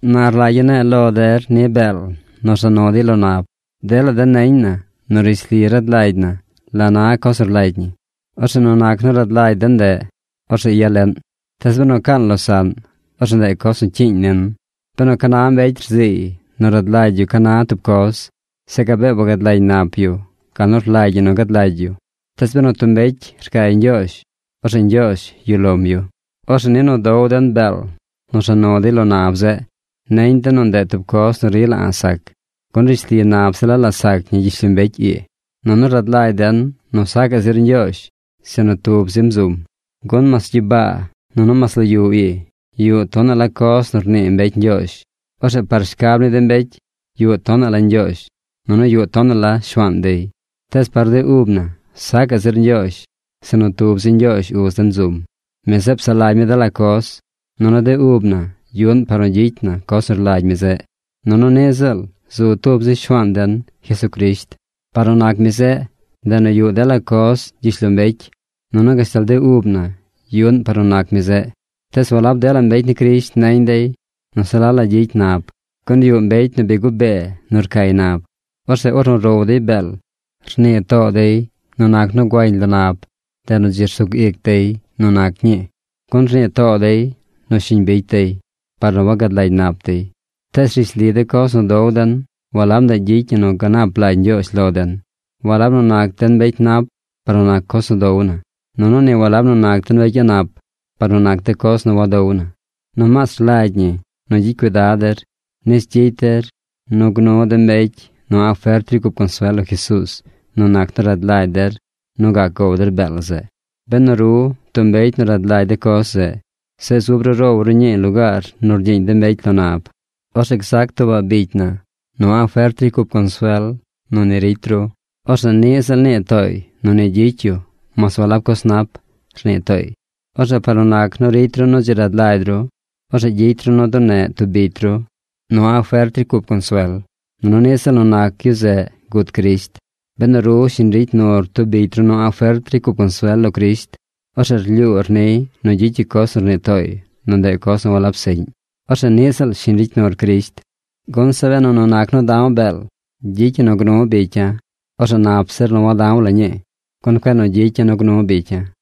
Na rlagya̱ ne̱e̱ lo der ni de beel nu rza nu dey lo nab. Dela den neñ na nu rishli rad lagy na la na coz nu rlagy ñi. Orzeꞌ nu nac nu rad lagy den ndeꞌ, orzeꞌ yaleꞌn. Tees benu caan losaꞌn, orzeꞌ ndeꞌ coz nu cyiiñ nin. Benu ca na mbecy rziiy nu rad lagy yu ca na tub coz, zeꞌ gabee wagad lagy nap yu gal nu rlagy ñi nu gad lagy yu. Tees benu tub mbecy rcay Ñgyoozh, orzeꞌ Ñgyoozh yuꞌ lom yu. Orzeꞌ ni nu dow den beel nu rza nu dey lo nab zeꞌ: neñ den nu ndeꞌ tub coz nu rila a̱ꞌ sac, gun rishli nab se la la sac ñi gyishlombecy ii, nunu rad lagy den nu sacaꞌ zir Ñgyoozh, sinu tub zim zum. Gun mas gyibaa nunu mas lo yu ii yuꞌ tonaꞌ la coz nu rnii mbecy ñgyoozh. Orzeꞌ par shcab ni de mbecy, yuꞌ tonaꞌ la ñgyoozh, nunu yuꞌ tonaꞌ la shuaan dey. Tees par de ub na, sacaꞌ zir Ñgyoozh, sinu tub zi Ñgyoozh uz den zum. Mi zeꞌ psaꞌ lagy mi dela coz. Nunu de ub na yuꞌn par nu gyicy na coz nu rlagy mi zeꞌ. Nunu niꞌ ziꞌl zu tub zi Shuaan den, Jesucrisht. Par nu nac mi zeꞌ, ndeꞌ nu yuꞌ dela coz gyishlombecy, nunu gashtal de ub na yuꞌn par nu nac mi zeꞌ. Tees walab dela mbecy ni Crisht neñ dey nu se la la gyicy nab. Gun yuꞌ mbecy nu bi gubee nu rcay nab. Orzeꞌ ornu row dey beel, rnii too dey nu nac nu guañ lo nab, ndeꞌ nu dzi sug ic dey nu nac ñii, gun rnii too dey nu shiñ bicy dey, par nu wagad lagy nap dey. Tees rishli de coz nu dow den walab ndeꞌ gyicy ñi nu ganap lagy Ñgyoozh lo den. Walab nu nac den mbecy nap par nu nac coz nu dow na. Nunu ni walab nu nac den mbecy a̱ꞌ nap par nu nac de coz nu wadow na. Nomaas rlagy ñi nu gyicy cuidad der nis gyicy der nu gnu de mbecy nu a̱ꞌ fert ricy cup consuel lo Jesuuz nu nac nu rad lagy der nu gac gow der beel zeꞌ. Benu ru, tub mbecy nu rad lagy de coz zeꞌ, zeꞌ zub ru row ru ñii lugaar nu rgyiiñ de mbecy lo nab, orzeꞌ gzac tuubaꞌ bicy na nu a̱ꞌ fert ricy cup consuel nu ni ricy ru. Orzeꞌ niꞌ ziꞌl nii tooy nu ni gyicy yu mas walab coz nap, rnii tooy. Orzeꞌ par nu nac nu ricy ru nu dzi rad lagy ru, orzeꞌ gyicy ru nu duneꞌ tub bicy ru nu a̱ꞌ fert ricy cup consuel. Nunu niꞌ ziꞌl nu nac yu zeꞌ gut Crisht. Benu ru shiñ ricy nur tub bicy ru nu a̱ꞌ fert ricy cup consuel lo Crisht, ornu rlyuur niy nu gyicy yu coz nu rnii tooy nu ndeꞌ coz nu walab seꞌñ, orzeꞌ niꞌ ziꞌl shiñ ricy nur Crisht. Gun zeꞌ benu nu nac nu da̱w beel gyicy ñi nu gnu bicya̱, orzeꞌ nap zir nu wada̱w la ñii, gun cueꞌ nu gyicya̱ nu gnu bicya̱.